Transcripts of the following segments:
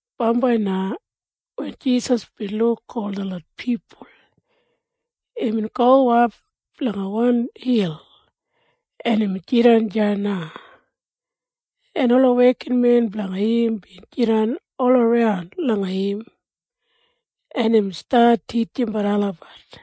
Bambai na wen Jisas bin luk ol detlot pipul, imbin gowap langa wan hil, en imbin jidan deya na, en ola wekinmen blanga im bin jidan olaran langa im, en imbin stat titjimbat olabat.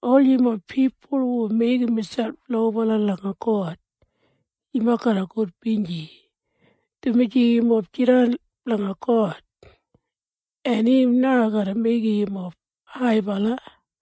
“Ol yumob pipul hu meigim miselp lobala langa God, yumob garra gudbinji, dumaji yumob jidan blanga God, en im na garra meigim yumob haibala.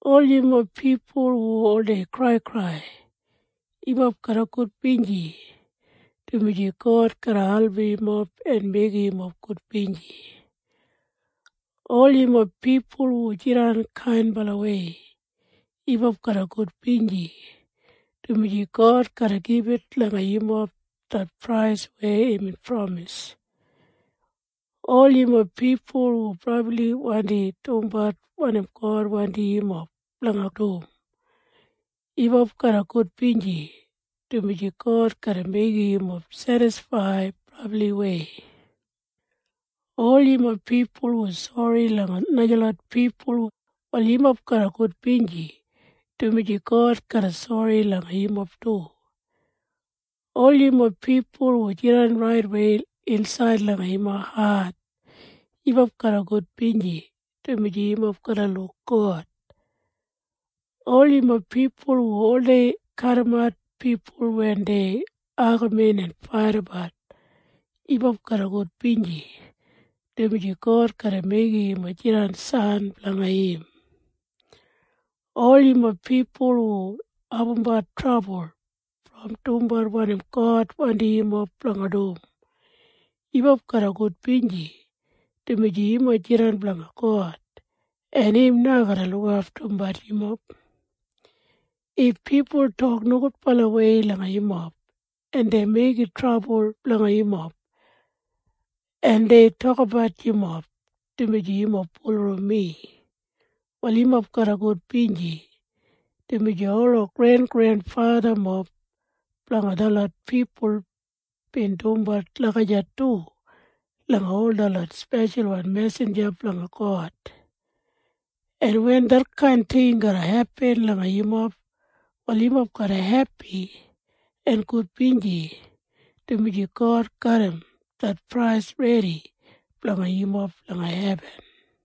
“Ol yumob pipul hu oldei kraikrai, yumob garra gudbinji, dumaji God garra album yumob en meigim yumob gudbinji. “Ol yumob pipul hu jidan kainbalawei, yumob garra gudbinji, dumaji God garra gibit langa yumob det prais weya imbin pramis. “Ol yumob pipul hu brabli wandi dumbat wanim God wandim yumob blanga dum, yumob garra gudbinji, dumaji God garra meigim yumob sedisfaid brabliwei. “Ol yumob pipul hu sori langa najalot pipul, wal yumob garra gudbinji, dumaji God garra sori langa yumob du. “Ol yumob pipul hu jidan raitwei insaid langa yumob hat, yumob garra gudbinji, dumaji yumob garra luk God. “Ol yumob pipul hu oldei kadimat pipul wen dei agamin en faitabat, yumob garra gudbinji, dumaji God garra meigim yumob jidan san blanga im. “Ol yumob pipul hu abumbat trabul brom dumbat wanim God wandim yumob blanga dum, yumob garra gudbinji, dumaji yumob jidan blanga God, en im na garra lukaftumbat yumob. “If pipul tok nogudbalawei langa yumob, en dei meigim trabul blanga yumob, en dei tokabat yumob, dumaji yumob bulurrum mi, wal yumob garra gudbinji, dumaji ola grengrenfathamob blanga detlot pipul bin dumbat lagijat du langa ol detlot speshalwan mesinja blanga God. En wen detkain ting garra hepin langa yumob, wal yumob garra hepi en gudbinji, dumaji God garram det prais redi blanga yumob langa hebin.”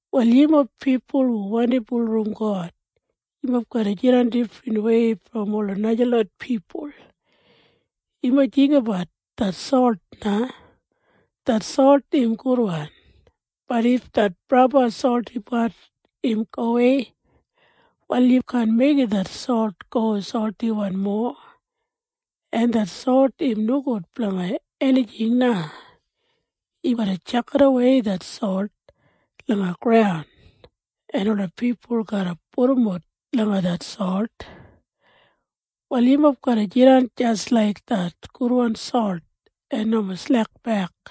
“Wal yumob pipul hu wandi bulurrum God, yumob garra jidan difrinwei brom ola najalot pipul. “Yumob jinggabat det solt na. Det solt im gudwan. Bat if det brabli soltipat im gowei, wal yu kaan meigim det solt go soltiwan mowa, en det solt im nogud blanga enijing na. Yu garra tjakidawei det solt langa graun, en ola pipul garra pudumbut langa det solt. Wal yumob garra jidan jis laik det gudwan solt en nomo slekbek.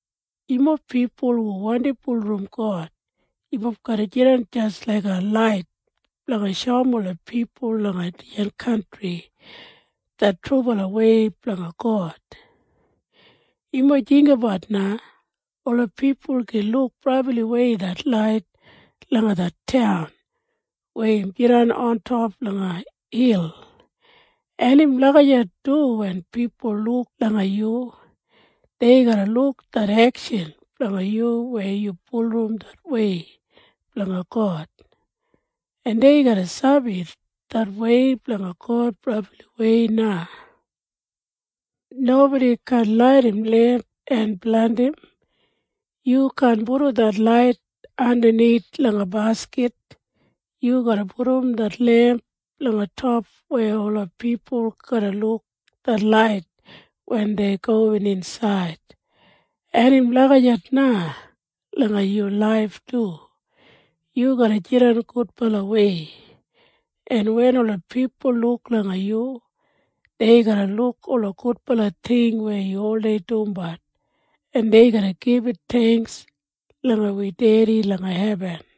“Yumob pipul hu wandi bulurrum God, yumob garra jidan jis laiga lait blanga shoum ola pipul langa dijan kantri det trubalawei blanga God. “Yumob jinggabat na. Ola pipul gin luk brabliwei det lait langa det taun weya im jidan ontop langa hil. En im lagijat du wen pipul luk langa yu. Dei garra luk det ekshan blanga yu weya yu bulurrum det wei blanga God, en dei garra sabi det wei blanga God brabliwei na. “Nobodi kaan laidim lemp en blandim. Yu kaan pudum det lait andanith langa baskit. Yu garra pudum det lemp langa top weya ola pipul garra luk det lait wen dei gowin insaid. En im lagijat na langa yu laif du. Yu garra jidan gudbalawei, en wen ola pipul luk langa yu, dei garra luk ola gudbala ting weya yu oldei dumbat, en dei garra gibit theingks langa wi Dedi langa hebin.”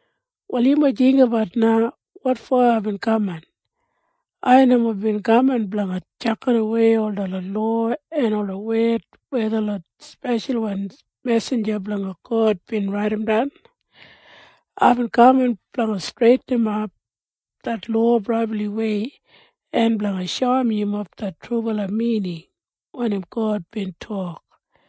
“Wal yumob jinggabat na wotfo aibin kaman. Ai nomo bin kaman blanga tjakidawei detlot lowa en ola wed weya detlot speshalwan mesinja blanga God bin raidimdan. Aibin kaman blanga streitinimap det lowa brabliwei en blanga shoum yumob det trubala mining wanim God bin tok.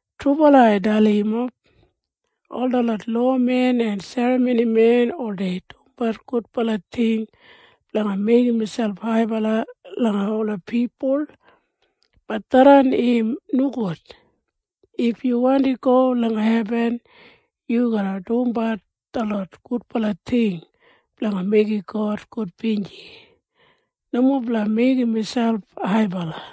“Trubala ai dalim yumob. Ol detlot lowamen en serramonimen oldei dumbat gudbala ting blanga meigim miselp haibala langa ola pipul. Bat tharran im nogud. If yu wandi go langa hebin, yu garra dumbat detlot gudbala ting blanga meigim God gudbinji, nomo blanga meigim miselp haibala.”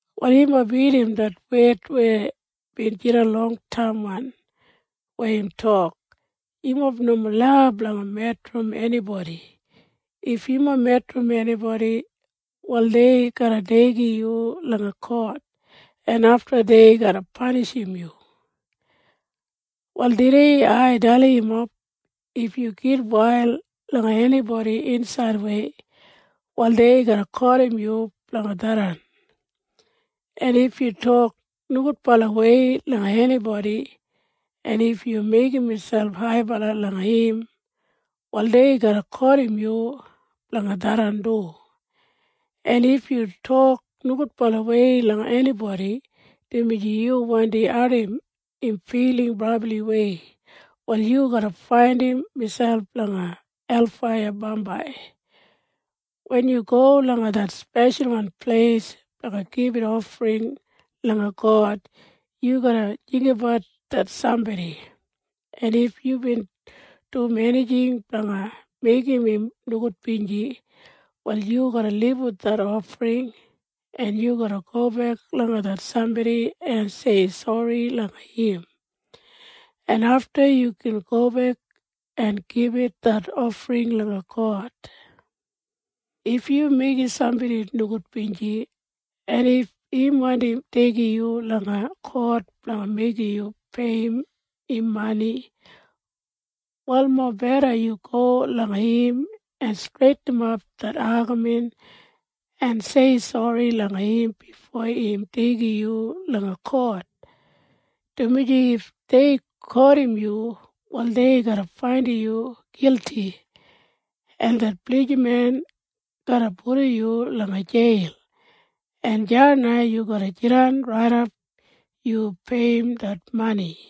“Wal yumob bin irrim det wed weya bin jidan longtaimwan weya im tok, ‘Yumob nomo lau blanga medrim enibodi. If yu medrim enibodi, wal dei garra deigim yu langa kot, en afta dei garra panishim yu.’ “Wal tudei ai dalim yumob. If yu gitwail langa enibodi insaidwei, wal dei garra kotim yu blanga tharran. En if yu tok nogudbalawei langa enibodi, en if yu meigim miselp haibala langa im, wal dei garra kotim yu blanga tharran du. En if yu tok nogudbalawei langa enibodi dumaji yu wandi ardim im filing brabliwei, wal yu garra faindim miselp langa helfaiya bambai. “Wen yu go langa det speshalwan pleis blanga gibit ofring langa God, yu garra jinggabat det sambodi, en if yubin dum enijing blanga meigim im nogudbinji, wal yu garra libum det ofring, en yu garra gobek langa det sambodi en sei sori langa im, en afta yu gin gobek en gibit det ofring langa God. “If yu meigim sambodi nogudbinji, en if im wandi deigim yu langa kot blanga meigim yu peiyim im mani, wal mobeda yu go langa im en streitinimap det agamin en sei sori langa im bifo im deigim yu langa kot, dumaji if dei kotim yu, wal dei garra faindim yu gilti, en det blijiman garra pudum yu langa jeil, en deya na yu garra jidan raidap yu peiyim det mani.”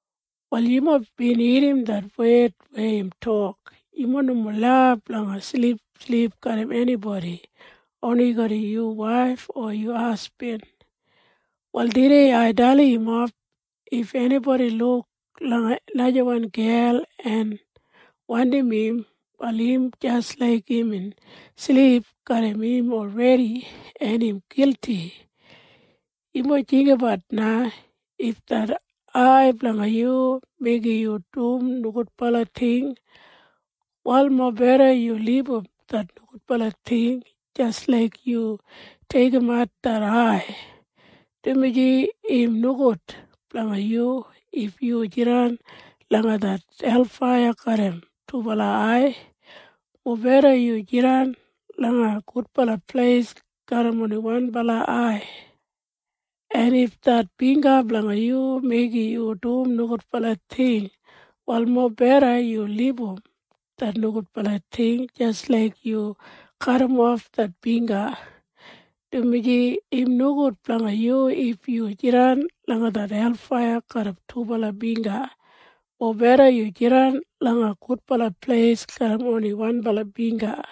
“Wal yumob bin irrim det wed weya im tok, ‘Yumob nomo lau blanga silipsilip garram enibodi, oni yu waif o yu hasbin.’ “Wal tudei ai dalim yumob. If enibodi luk langa najawan gel en wandim im, wal im jis laik imbin silip garram im olredi, en im gilti. “Yumob jinggabat na. If det ai blanga yu meigim yu dum nogudbala ting, wal mobeda yu libum det nogudbala ting jis laik yu deigimat det ai, dumaji im nogud blanga yu if yu jidan langa det helfaiya garram dubala ai. Mobeda yu jidan langa gudbala pleis garram oni wanbala ai. En if det bingga blanga yu meigim yu dum nogudbala ting, wal mobeda yu libum det nogudbala ting jis laik yu kadimof det bingga, dumaji im nogud blanga yu if yu jidan langa det helfaiya garram dubala bingga. Mobeda yu jidan langa gudbala pleis garram oni wanbala bingga.”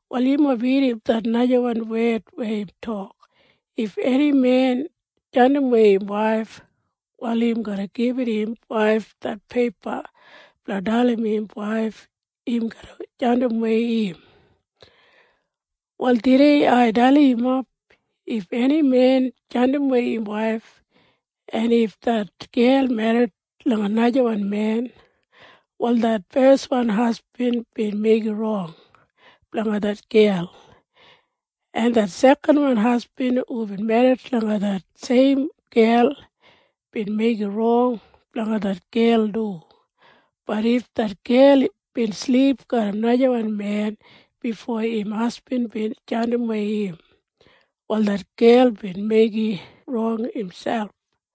“Wal yumob bin irrim det najawan wed weya im tok, ‘If eni men jandimwei im waif, wal im garra gibit im waif det peipa blanga dalim im waif im garra jandimwei im.’ “Wal tudei ai dalim yumob. If eni men jandimwei im waif, en if det gel merrit langa najawan men, wal det feswan hasbin bin meigim rong blanga det gel, en det sekanwan hasbin hubin merrit langa det seim gel, bin meigim rong blanga det gel du. Bat if det gel bin silip garram najawan men bifo im hasbin bin jandimwei im, wal det gel bin meigim rong miselp.”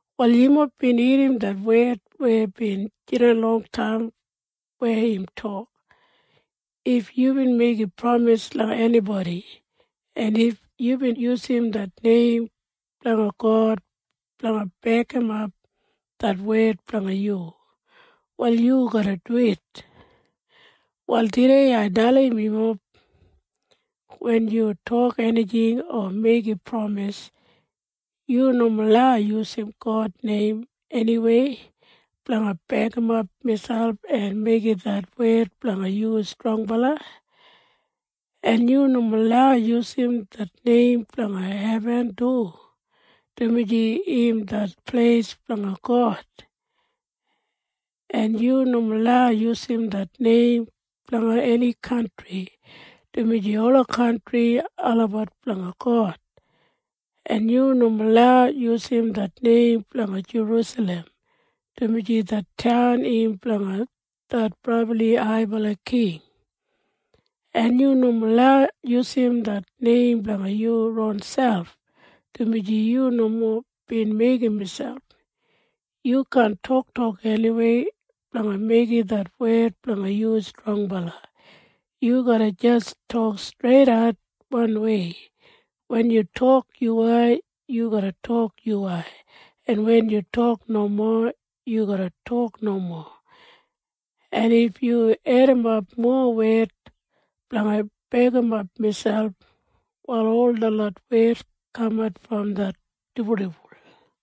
“Wal yumob bin irrim det wed weya bin jidan longtaim weya im tok, ‘If yubin meigim pramis langa enibodi, en if yubin yusum det neim blanga God blanga bekimap det wed blanga yu, wal yu garra duwit.’ “Wal tudei ai dalim yumob. Wen yu tok enijing o meigim pramis, yu nomo lau yusum God neim eniwei blanga bekimap miselp en meigim det wed blanga yu strongbala. En yu nomo lau yusum det neim blanga hebin du, dumaji im det pleis blanga God. En yu nomo lau yusum det neim blanga eni kantri, dumaji ola kantri olabat blanga God. En yu nomo lau yusum det neim blanga Jerusalem, dumaji det taun im blanga det brabli haibala King. En yu nomo lau yusum det neim blanga yu ronselp, dumaji yu nomo bin meigim miselp. Yu kaan toktok eniwei blanga meigim det wed blanga yu strongbala. Yu garra jis tok streidat wanwei. Wen yu tok yuwai, yu garra tok yuwai, en wen yu tok nomo, yu garra tok nomo. En if yu edimap mowa wed blanga bekimap miselp, wal ol detlot wed kaman brom det dibuldibul.”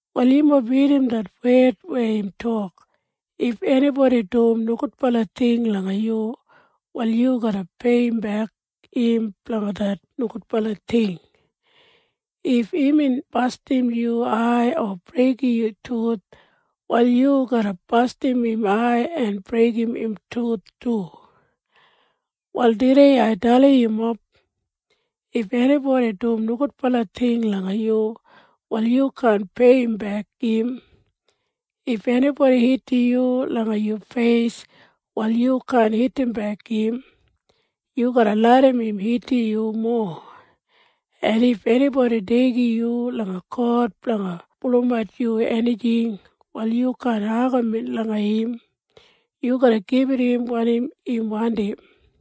“Wal yumob bin irrim det wed weya im tok, ‘If enibodi dum nogudbala ting langa yu, wal yu garra peiyimbek im blanga det nogudbala ting. If imbin bastim yu ai o breigim yu tuth, wal yu garra bastim im ai en breigim im tuth du.’ “Wal tudei ai dalim yumob. If enibodi dum nogudbala ting langa yu, wal yu kaan peiyimbek im. If enibodi hitim yu langa yu feis, wal yu kaan hitimbek im. Yu garra larram im hitim yu mowa. En if enibodi deigim yu langa kot blanga pulumat yu enijing, wal yu kaan agamin langa im. Yu garra gibit im wanim im wandim.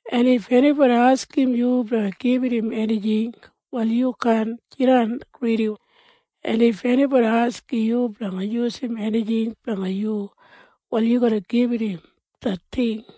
En if enibodi askim yu blanga gibit im enijing, wal yu kaan jidan gridi. En if enibodi askim yu blanga yusum enijing blanga yu, wal yu garra gibit im det ting.”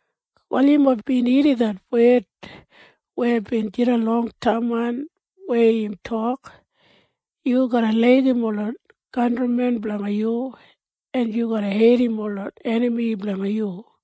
“Wal yumob bin irrim det wed weya bin jidan longtaimwan weya im tok, ‘Yu garra laigim ola kantrimen blanga yu, en yu garra heidim ola enami blanga yu.’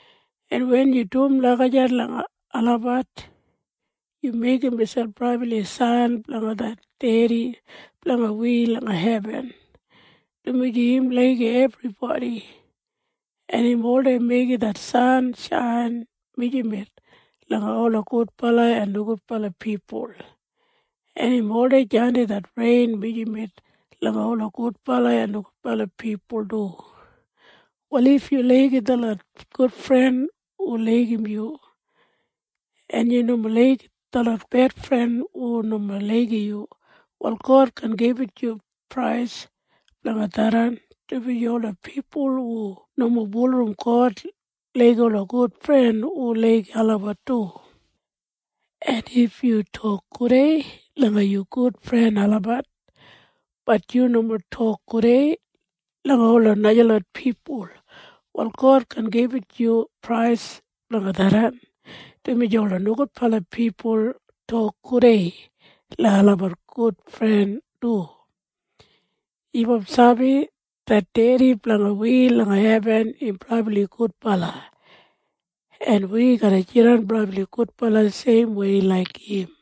En wen yu dum lagijat langa olabat, yu meigim miselp brabli san blanga det Dedi blanga wi langa hebin, dumaji im laigim ebribodi, en im oldei meigim det san shain mijamet langa ola gudbala en nogudbala pipul, en im oldei jandim det rein mijamet langa ola gudbala en nogudbala pipul du. “Wal if yu laigim detlot gudfren hu laigim yu, en yu nomo laigim detlot bedfren hu nomo laigim yu, wal God kaan gibit yu prais blanga tharran, dumaji ola pipul hu nomo bulurrum God laigim ola gudfren hu laigim olabat du. “En if yu tok gudei langa yu gudfren olabat, bat yu nomo tok gudei langa ola najalot pipul, wal God kaan gibit yu prais blanga tharran, dumaji ola nogudbala pipul tok gudei langa olabat gudfren du. “Yumob sabi? Det Dedi blanga wi langa hebin im brabli gudbala, en wi garra jidan brabli gudbala seimwei laik im.”